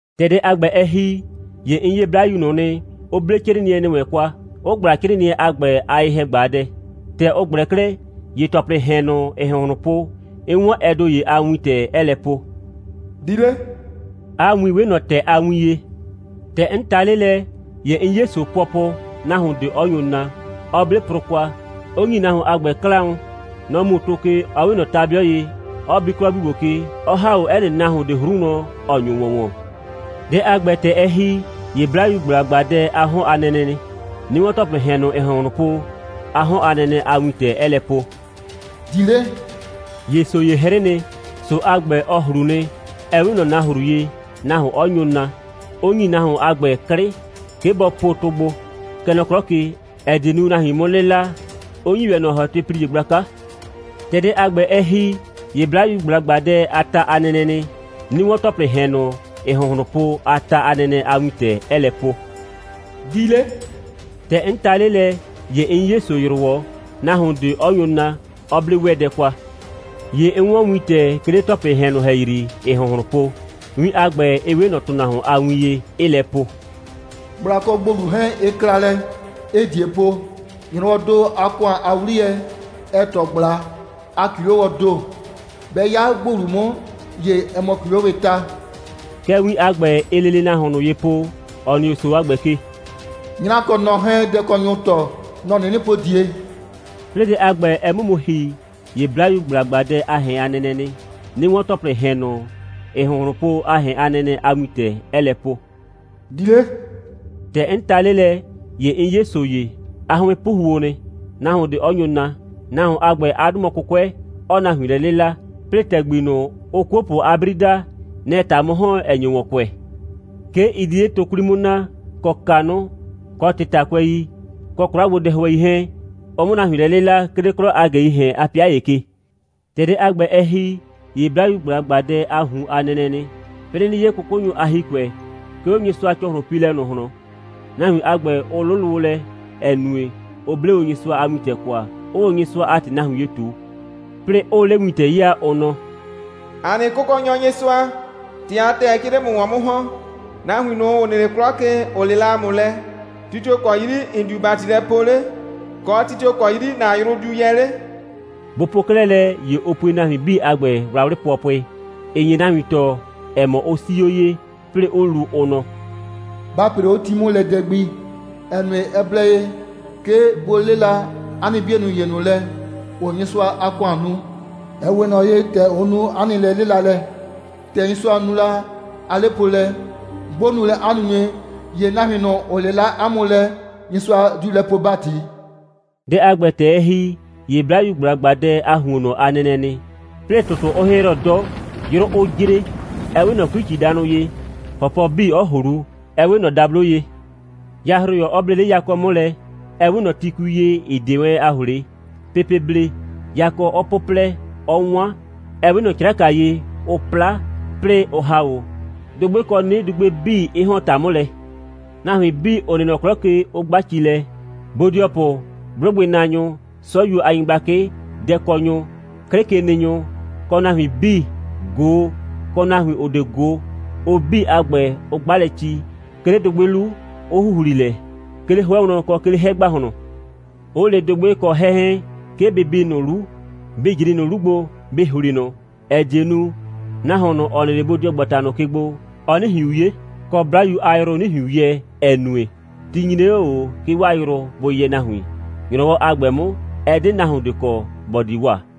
‑Tɛ dɛ a ‑gbɛ, ɛ ‑hi, ‑ye 'n 'ye 'Blayu ꞊nʋ nɩ, ‑ʋ 'ble 'crɩɩnɩɛ ‑nɩ wɛn kwa, 'ʋ ꞊gbla 'crɩɩnɩɛ a ‑gbɛ a ye‑hɛ꞊gbaadɛ. ‑Tɛ ʋ ꞊gblɛ 'klɛɛ, ‑ye ‑tɔplɩɩ ‑hɛn ꞊nʋ, ‑ɩɩ ‑hʋnhlʋn po, 'n 'wɔn ɛ ‑do ‑ye a wintɛ, 'ɛɛ lɛ po: «Di 'le!» 'A win 'we ꞊nɔ ‑tɛ a win ye. ‑Tɛ 'n ta 'le lɛ, ‑ye 'n 'ye ‑so pʋɔpʋ, nahuon ꞊de 'ɔ nyo naa, 'ɔ 'ble prʋ kwa, 'ʋ ‑nyi nahuon a ‑gbɛ 'klaʋn. Nɔ‑ mu tʋ ke, ‑ɔ 'we ꞊nɔ ta'bɩʋ ye, 'ɔ bi 'klɔ 'bii ‑gbo ke, 'ɔ ‑ha 'o 'ɛ nɩ nahuon ꞊de 'hru wlɔn, ‑ɔ nyo ‑wɔn ‑wɔn. Dɛ a ‑gbɛ, ‑tɛ ɛ ‑hi, ‑ye 'Blayu ꞊gbla ꞊gbaadɛ a 'hɔn a nɛnɛ nɩ, 'nɩ 'wɔn ‑tɔplɩɩ ‑hɛn ꞊nʋ, ‑ɩɩ ‑hʋnhlʋn po, 'a 'hɔn a nɛnɛ a wintɛ, 'ɛɛ lɛ po: «Di 'le!» ‑Ye ‑so ‑ye 'hrɩ nɩ. ‑So a ‑gbɛ, ɔ ꞊hlu nɩ, ‑ɛ 'we ꞊nɔ nahru ye, nahuon 'ɔ nyo naa, 'ʋ ‑nyi nahuon a ‑gbɛ 'klɩ, 'ke bɔ po tʋ gbo, kɛ nɔ 'klɔ ke, ‑ɛ die nu, nahuin 'mʋ 'lɩla, 'ʋ ‑nyi ‑wɛ ꞊nɔ ‑hɔtɩplie gblaka. ‑Tɛ dɛ a ‑gbɛ, ɛ ‑hi, ‑ye 'Blayu ꞊gbla ꞊gbaadɛ a ta a nɛnɛ nɩ, 'nɩ 'wɔn ‑tɔplɩɩ ‑hɛn ꞊nʋ, ‑ɩɩ ‑hʋnhlʋn po, 'a ta a nɛnɛ a wintɛ, 'ɛɛ lɛ po: «Di 'le!» ‑Tɛ 'n ta 'le lɛ, ‑ye 'n 'ye ‑so ‑yrʋwɔ, nahuon ꞊de 'ɔ nyo naa, 'ɔ 'ble 'wɛɛdɛ kwa. ‑Ye 'n 'wɔn wintɛ, 'ke 'le ‑tɔplɩɩ ‑hɛn ꞊nʋ ‑hɛyri, ‑ɩɩ ‑hʋnhlʋn po. Win a ‑gbɛ, ɩ 'we ꞊nɔ ‑tʋnahuon a win ye, 'ɩɩ lɛ po: «꞊Gbla kɔ ‑gbolu 'hɛɛn, ɩ kla lɛ, 'ɩɩ ꞊die po. ‑Nyrɔwɔɔ ‑do a ‑kʋan a 'wliyɛ, ɛɛ ‑tɔ ꞊gbla a ‑kilowɔɔ ‑do. 'Bɛ 'ya ‑gbolu 'mʋ, ‑ye ɛ mɔ ‑kilowɩɩ ta.» Kɛ win a ‑gbɛ, ɩɩ lele nahuon ꞊nʋ ye po, ‑ɔ nɩ 'o ‑so a ‑gbɛ ke: «'Nyra kɔ nɔ 'hɛɛn, dɛkɔnyʋʋ ‑tɔ, nɔ‑ 'nɩnɩ po ꞊die.» 'Plɩɩ dɛ a ‑gbɛ, ɛ 'mʋ mu ‑hi, ‑ye 'Blayu ꞊gbla ꞊gbaadɛ a ‑hɛn a nɛnɛ nɩ, 'nɩ 'wɔn ‑tɔplɩɩ ‑hɛn ꞊nʋ, ‑ɩɩ ‑hʋnhlʋn po, 'a ‑hɛn a nɛnɛ a wintɛ, 'ɛɛ lɛ po: «Di 'le!» ‑Tɛ 'n ta 'le lɛ, ‑ye 'n 'ye ‑so ‑ye. 'A 'hʋɩn 'puhuo nɩ, nahuon ꞊de 'ɔ nyo naa. Nahuon a ‑gbɛ, 'a 'dʋ mɔ 'kʋkʋɛ, 'ɔɔ nahuin lɛ 'lɩla, 'plɩɩ ‑tɛgbi ꞊nʋ, ʋʋ 'kuopʋ a 'bri daa, nɛ‑ɛ ‑ta 'mʋ ‑hɔn, 'ɛ nyo ‑wɔn kʋɛ. 'Ke ɩ di 'le tʋ 'kwli 'mʋ naa, kɔ kanʋ, kɔ ꞊tɩtakʋɛi, kɔ 'kwla gbo a dɛhʋɛi 'hɛɛn, ʋ 'mʋ nahuin lɛ 'lɩla, 'ke 'le 'klɔ a ꞊gɛii ‑hɛn a 'pɩa ‑ye ke. ‑Tɛ dɛ a ‑gbɛ, ɛ ‑hi, ‑ye 'Blayu ꞊gbla ꞊gbaadɛ a ꞊hun a nɛnɛ nɩ, 'plɩɩ 'nɩ 'ye 'kʋkʋnyʋ a ‑hikʋɛ, 'ke 'o Nyɩsʋa‑cɔhlʋnpiilɛ ꞊nʋ ꞊hlɔn. Nahuin a ‑gbɛ, ʋ 'lʋlʋ o lɛ, ‑ɛ nue, ʋ 'ble o Nyɩsʋa a wintɛ kwa, 'ʋʋ o Nyɩsʋa a ‑tɩ nahuin ye ꞊tu; 'plɩɩ 'ʋʋ 'le wintɛ 'yaa, ʋ nɔ: «‑A nɩ Kʋkɔnyɔ Nyɩsʋa, ‑tɩ a ‑tɛɛ, 'ke ɩɩ 'le ‑mʋ ‑wɔn 'mʋ ‑hɔn. Nahuin ꞊nʋ, ‑ʋ nɩ 'le 'klɔ ke, ‑ʋ 'lɩla ‑a mʋ lɛ, ti tio‑ kɔ 'yri ‑n diu ‑bati lɛ poo 'le, kɔ, ti tio‑ kɔ 'yri ‑na yrʋ diu yɛ 'le?» Bʋ po 'klɛɛ lɛ, ‑ye ʋ pue nahuin 'bii a ‑gbɛ wlawlɩ pʋɔpʋɩ, (‑ɩ nye nahuin tɔɔ, ‑ɛ mɔ, ʋ 'sii 'o ye,) 'plɩɩ 'ʋ lu, ʋ nɔ: «Ba ‑pree 'o ti 'mʋ lɛ dɛ gbi, ‑ɛ nue, ɛ blɛ ye, 'ke bʋ 'lɩla 'a nɩ 'bienʋ ‑ye ꞊nʋ lɛ, ‑ʋʋ Nyɩsʋa a ‑kʋan nu, ‑ɛ 'we ꞊nɔ ye, ‑tɛ ʋ nu 'a nɩ lɛ'lɩlalɛ. ‑Tɛ Nyɩsʋa nu la 'a 'lepoolɛ, 'bʋ nu lɛ 'a nunue, ‑ye nahuin ꞊nʋ, ‑ʋ 'lɩla 'a mʋ lɛ, Nyɩsʋa diu lɛ poo ‑bati.» Dɛ a ‑gbɛ, ‑tɛ ɛ ‑hi, ‑ye 'Blayu ꞊gbla ꞊gbaadɛ a ‑huonnɔ a nɛnɛ nɩ, 'plɩɩ, ‑tʋtʋ 'ʋ 'hɩhrɔ 'dɔ, 'yrʋ 'ʋ jre, ‑ɛ 'we ꞊nɔ 'kui꞊cidanʋ ye, ‑hɔpɔ 'bii 'ɔ ꞊hlu, ‑ɛ 'we ꞊nɔ dablo ye, yahroyɔ 'ɔ ble 'le yakɔ 'mʋ lɛ, ‑ɛ 'we ꞊nɔ tikui ye, ‑ɩ 'de wɛn a ꞊hlee, pepee blee, yakɔ 'ɔ 'pʋplɛ, 'ɔ 'wan, ‑ɛ 'we ꞊nɔ 'craka ye, ʋ 'pla, 'plɩɩ, ʋ ‑ha 'o; dʋgbɩ kɔ 'nɩdugbe 'bii 'ɩ ‑hɔn ‑ta 'mʋ lɛ; nahuin 'bii, ‑ʋ nɩ nɔ 'klɔ ke, 'ʋ 'gba ci lɛ, bodɩɔpʋ, 'blʋgbɩnaanyʋ, 'sɔyuo a nyɩgblakɩ, dɛkɔnyʋ, 'klɩkenɩnyʋ, kɔ nahuin 'bii, ꞊go, kɔ nahuin, ‑ʋ 'de ꞊go, ʋ 'bii a ‑gbɛ, ʋ 'gba lɛ ci, 'ke 'le dʋgbɩ 'lu, 'ʋ ‑huhli lɛ, 'ke 'le 'hʋɛ wlɔn, kɔ 'ke 'le 'hɛ ‑gbahlɔn, 'ʋ le dʋgbɩ kɔ 'hɛ 'hɛɛn, 'ke bɩ bi ꞊nʋ 'lu, bɩ ꞊jri ꞊nʋ 'lu gbo, bɩ ‑hli ꞊nʋ, ‑ɛ die nu, nahuon ꞊nʋ, ‑ɔ nɩ 'le bodɩɔgbata ꞊nʋ ke gbo, ɔ 'nɩ ꞊hiun 'ye, kɔ, 'Blayu a yrʋ 'nɩ ꞊hiun yɛ, ‑ɛ nue, ti nyre 'o ꞊o, 'ke 'waa yrʋ bʋ yɛ nahuin. ‑Nyrɔwɔ a ‑gbɛ 'mʋ, ɛ 'de nahuon ꞊de kɔ, ‑bɔ di wa.